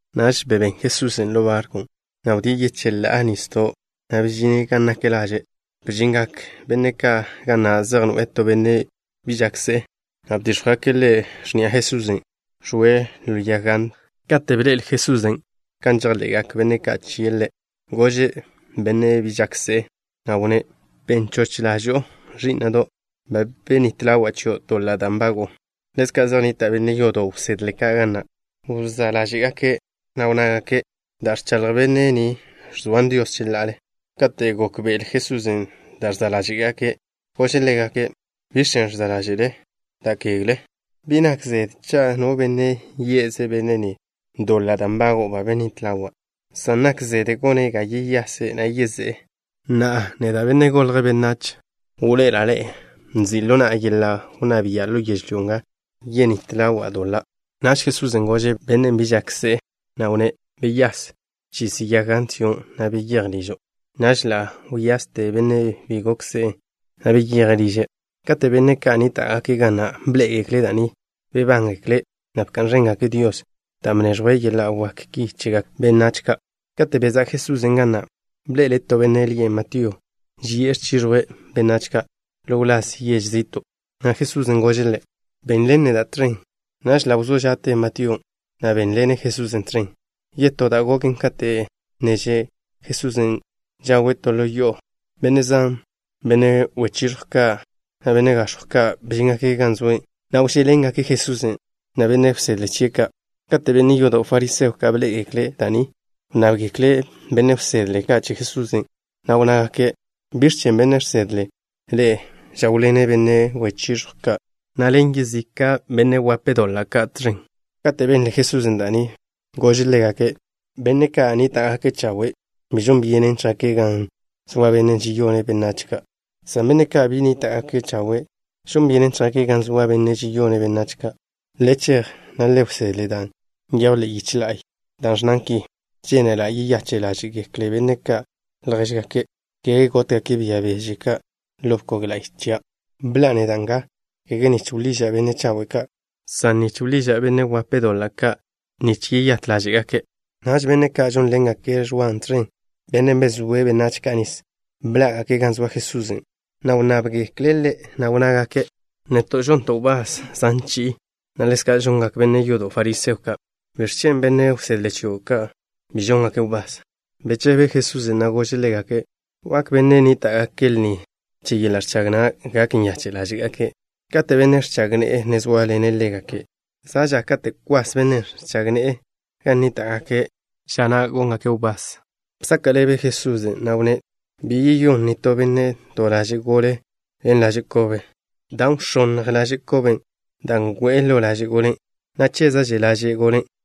Naž bebén Jesusen' ḻo barkw, na' wdíe' yecheḻá'a nisdon', na' bežine' gan nak laže'. Bžingak benne' ka' ga na' zej noe'e to benne' bi žak se'e, na' bdíx̱jwgake' ḻe' x̱ni'a Jesusen', ẕoe' ḻo yag gant. Kate' bḻe'el Jesusen' kan žejḻe'gak benne' ka' chie' Ḻe', gože' bennen' bi žak se'e, na' wnné': —Ben choch ḻažo'o, ẕí'na'do'. Ba benít ḻawa' chio' doḻa' da' nbago'o. Ḻezka' zej nnita' benne' yodo' wsedle ka' ga na'. Wzá' ḻáže'gake', na' wnnágake': —Da' ẕchaḻj benne' ni ẕzoan Dios cheḻa'ale. Kate' gókbe'ele Jesusen' da' ẕza' ḻáže'gake', gože' ḻégake': —¿Biẕ chen' ẕza' ḻáže'le da' kegle? Bi nak zede cha' no benne' yí'aze' benne' ni: “Doḻa' da' nbago'o ba benít ḻawa'” san nak zede gone' ga yeyase', na' yezé'e. Na'a, neda', Benne' Golje' Benách, wḻoe'ela' ḻe'e nzi' ḻo na'a yeḻa' wnná bia' ḻo yežlyó nga yenít ḻawa' doḻa'. Naž Jesusen' gože' bennen' bi žak se'e, na' wnné': —Beyás. Bchis yag gant chion', na' beyéj ližo'. Naž ḻa' wyaste bennen' bi gok se'e, na' beyeje' liže'. Kate' benne' ka' nníta'gake' ga na' bḻé'egekle' da' ni, bebángekle', na' bka'n ẕéngake' Dios dan' bneẕjwe' yeḻa' wak ki chegak benách ka'. Kate' bezá' Jesusen' ga na', bḻe'ele' to benne' lie' Matío, ži'e gan ẕchiẕjwe' benách ka' ḻo wláz yež zi'to', na' Jesusen' gože' ḻe': —Benḻen neda' tẕen. Naž ḻa' wzó ža'te Matíon', na' bénḻene' Jesusen' tẕen. Yetó da' goken, kate' ne že' Jesusen' žawe' to ḻo yo'o, benne' zan, benne' wechiẕjw ka' na' benne' gax̱jw ka', bžíngake' gan zoe', na' wžé'ḻengake' Jesusen' na' benne' wsedle chie' ka'. Kate' benne' yodo' fariseo ka' bḻé'egekle' da' ni, wnnábgekle' benne' wsedle ka' che Jesusen', na' wnnágake': —¿Biẕ chen' bennen' žsedle' ḻe'e žáwḻene' benne' wechiẕjw ka', na' ḻen yezika' benne' doḻa' ka' tẕen? Kate' benle Jesusen' da' ni, gože' ḻégake': —Benne' ka' nníta'gake' chawe', bi žon byenen chjake' gan zoa benne' žeyone' benách ka', san benne' ka' bi nníta'gake' chawe' žon byenen chjake' gan zoa bennen' žeyone' benách ka'. Le chej, na' le wsedle da' nyejw ḻe'e yiche la'y, da' ẕnnan ki: “Žénela' yeyache' ḻáže'gekle benne' ka' ljéžgake' ka', kege gótgake' bia beže ka' ḻo bkog la'y chia'.” Bḻa'a neda' nga, kege nich wḻiža' benne' chawe' ka', san nich wḻiža' benne' doḻa' ka' nich yeyát ḻáže'gake'. Naž benne' ka' žónḻengake' Ẕwa tẕen, bennen' bezóe' benách ka' nis, bḻá'gake' gan zoa Jesusen', na' wnnábgekle' Ḻe', na' wnnágake': —Neto' žonto' wbás zan chi'i, na' ḻezka' žongak benne' yodo' fariseo ka'. ¿Biẕ chen' benne' wsedle chio' ka' bi žóngake' wbás? Bechebe Jesusen', na' gože' ḻégake': —¿Wak benne' ka' nníta'gake' lni che yeḻa' ẕchag na' gak nyache' ḻáže'gake' kate' benne' ẕchag ne'e ne zóaḻene' ḻégake'? Za' ža kate' kwas bennen' ẕchag ne'e gan nníta'gake'. Ža na' góngake' wbás. Bsaka' ḻebe Jesusen', na' wnné': —Bi yeyón nitó benne' to laže' gole ḻen laže' kobe, dan' wx̱ónnj laže' koben' da' ngo'e lo ḻaže' golen', na' chéza'že laže' golen'.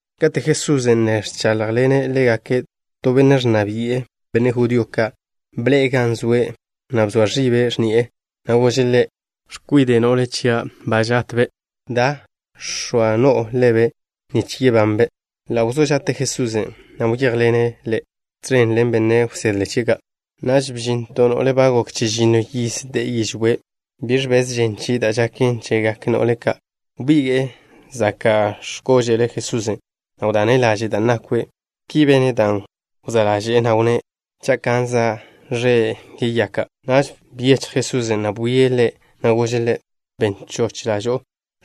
Kate' Jesusen' ne ẕcháḻjḻene' ḻégake', to benne' ẕnna bi'e benne' judío ka' bḻe'e gan zoe', na' bzoa ẕibe' x̱ni'e, na' gože' Ḻe': —X̱kwide' no'le chia' za' gotbe'. Da, x̱oa no'o ḻebe', nich yebanbe'. Ḻa' wzó ža'te Jesusen', na' wyéjḻene' ḻe', tẕen ḻen benne' wsedle chie' ka'. Naž bžin to no'le ba gok chežinno yiz de'e yižwé'. Bi ẕbez žen chie' da' žaken chégakkze no'le ka'. Wbige'e zaka' x̱kože'l Jesusen', na' wdane' laže' da' nakwe'. Ki bene' dan' wzá' ḻaže'e, na' wnné': “Cha' kanza' ẕe', yeyaka'.” Naž byechj Jesusen', na' bwie' ḻe', na' gože' ḻe': —Ben choch ḻažo'o,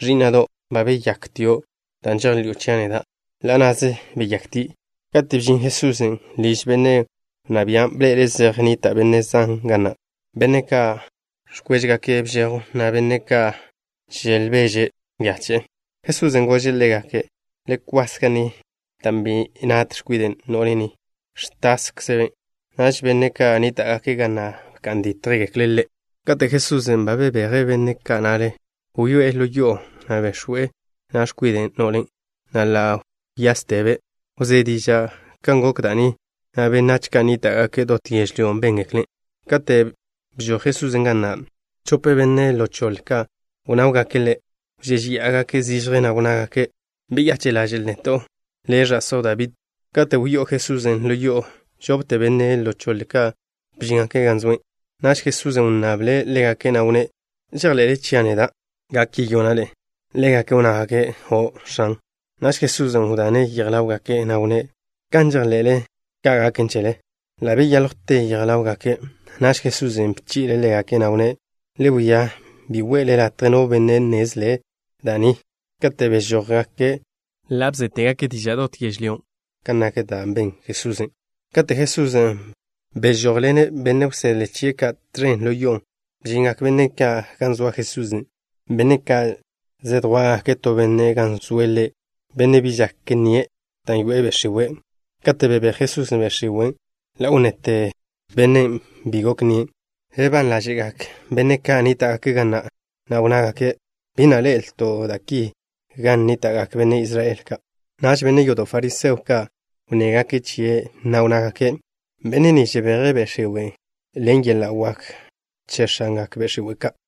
ẕí'na'do'. Ba beyaktio' dan' žejḻi'o chia' neda'. Ḻa' na'ze beyaktie'. Kate' bžin Jesusen' liž benne' wnná bian', bḻe'ele' zej nnita' benne' zan ga na', benne' ka' ẕkwéžegake' bžejw, na' benne' ka' želbeže nyache'e. Jesusen' gože' ḻégake': —Le kwas ga ni, dan' bi nat x̱kwide' no'le ni. Ẕtászebe'. Naž benne' ka' nníta'gake' ga na' bka'n dítjgekle' Ḻe'. Kate' Jesusen' ba bebeje' benne' ka' na'le, wyoé'e ḻo yo'o, na' bex̱we' na' x̱kwide' no'len', na' ḻa' wyástebe'. Wzé diža' kan gok da' ni, na' benách ka' nníta'gake' dot yežlyón' béngeklen'. Kate' bžoj Jesusen' ga na', chope benne' ḻo choḻe ka' wnáwgake' Ḻe'. Wžéžeya'agake' zižje, na' wnnágake': —Beyache' ḻaže'l neto', Le', ẕa'só Dabí. Kate' wyó'o Jesusen' ḻo yo'o, žopte benne' ḻo choḻe ka' bžíngake' gan zoe'. Naž Jesusen' wnnable' ḻégake', na' wnné': —¿Žejḻe'le chia' neda', gak yeyona' ḻe'e? Ḻégake' wnnágake': —O', X̱an. Naž Jesusen' wdane' yej ḻáwgake', na' wnné': —Kan žejḻe'le, ka' gaken chele. Ḻa' beyáljwte yej ḻáwgake'. Naž Jesusen' bchi'le' ḻégake', na' wnné': —Le wia bi we'le latje no benne' nnezle' da' ni. Kate' bežójgake', ḻa' bzétegake' diža' dot yežlyón' kan nak da' ben Jesusen'. Kate' Jesusen' bežójḻene' benne' wsedle chie' ka' tẕen ḻo yo'on', bžingak benne' ka' gan zoa Jesusen', benne' ka' zedjwá'gake' to benne' gan zoe' Ḻe', benne' bi žak nnie' dan' yoe'e be' x̱iwe'. Kate' bebéj Jesusen' be' x̱iwen', ḻa' wnnete bennen' bi gok nnie'. Bebán ḻáže'gak benne' ka' nníta'gake' ga na', na' wnnágake': —Bi na' ḻe'elto' da' ki gan nníta'gak benne' Israel ka'. Naž benne' yodo' fariseo ka' wnnégake' chie', na' wnnágake': —Benne' ni žebeje' be' x̱iwe' ka' ḻen yeḻa' wak che x̱angak be' x̱iwe' ka'.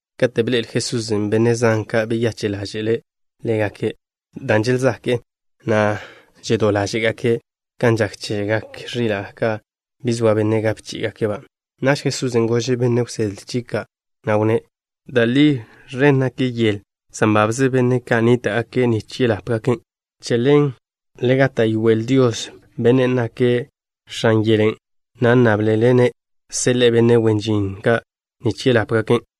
Kate' bḻe'el Jesusen' benne' zan ka', beyache' ḻáže'le' ḻégake', dan' želzake'e, na' žedó ḻáže'gake' kan žak chegak ẕila' ka' bi zoa benne' gape chí'igake'-ba'. Naž Jesusen' gože' benne' wsedle chie' ka', na' wnné': —Da' li, ẕen nak yel, san babze benne' ka' nníta'gake' nich ḻápgaken'. Che ḻen, le gáta'yoel Dios, Bennen' nake' X̱an yelen', na' nnáblele-ne' seḻe'e benne' wen žin ka', nich ḻápgaken'.